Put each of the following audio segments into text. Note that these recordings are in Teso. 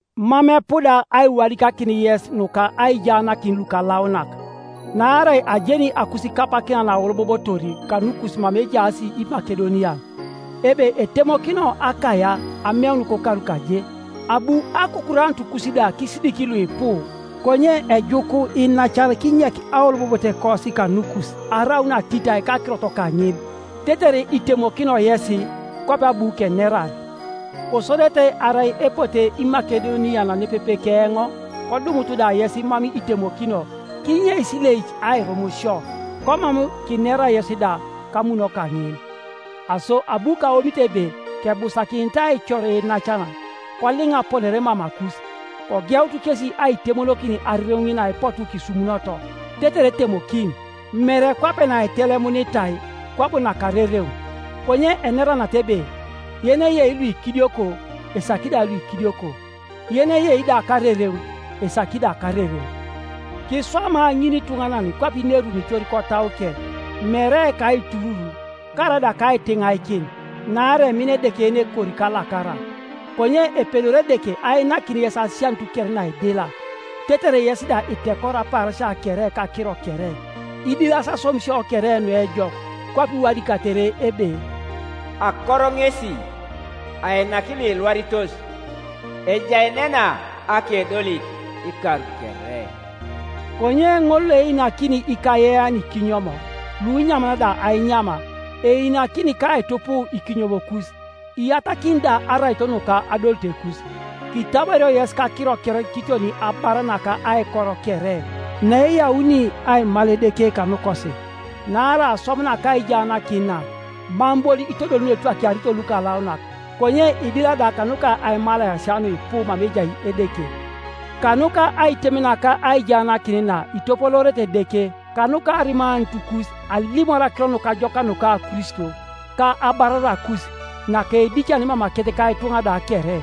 Mam epuda aiwadikakin yes nuka aijaanakin lukalaunak. Naarai ajeni akusikapakina naaolobobotor kanukus mama ejaas Imakedonian, ebe etemokino Akaia ameun kokaru kaje; abu akukuranutukus da kisidik luipu. Konye ejuku iinacan kinyek aolobobotekosi kanukus araun atitai kakirot kaŋin, tetere itemokino yesi, kwape abu kenerar; kosodete arai epote Imakedonian nepepe keoŋ kodumut da yes mam itemokino, kinyeis ilek airum sio, komam kinera yes da, kamuno kaŋin, Aso abu kaomit ebe kebusakinit aicor iinacan koliŋa aponare mamakus, kogeut kesi aitemokin arereŋ ŋin naipotu kisumunoto, tetere etemokin, mere kwape naitelemunitai kwabo nakarereŋ. Konye enera nata ebe, yeneyei luikidioko, esaki da luikidioko, yeneyei da karereŋ, esaki da karereŋ. Kiswama ŋinituŋanan kwape inerunitor kotauke, mere kaiturur karaida kaitiŋaikin, naarai emina Edeke yenekori kalakara. Konye epedori Edeke ainakin yes asianut kere naidila; tetere yes da itekoro apaarasia kere kakiro kere, idilas aswamisio kere nuejok. Kwape iwadikatere ebe, “Akoro ŋesi, ainaki Iuilwaritos, Ejaenena akedolit ikar kere.” Konye ŋol loeinakini ikayean ikinyom, lunyaman da ainyam, einakini ka aitupuu ikinyomokus, iyatakini da araito nuka adolitekus. Kitabario yes kakiro kere kiton abar naka aikor kere, naeyauni aimal Edeke kanukosi. Naarai aswam naka aijaanakin na mam bon itodoli nuetwakiarito lukalaunak, konye idila da kanuka aimalaesia nuipu mama ejai Edeke. Kanuka aitem naka aijaanakin na itopoloorete Edeke kanuka arimanutukus alimor Akiro Nukajokak nuka Kristo, ka abararakus naka eidicane mamakec ka ituŋa da kere;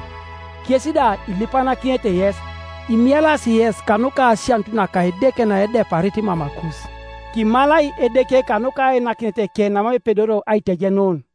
kes da ilipanakinete yes, imielas yes kanuka asianut naka Edeke naedeparit mamakus. Kimalai Edeke kanuka ainakineteke namam epedorio aitejenun!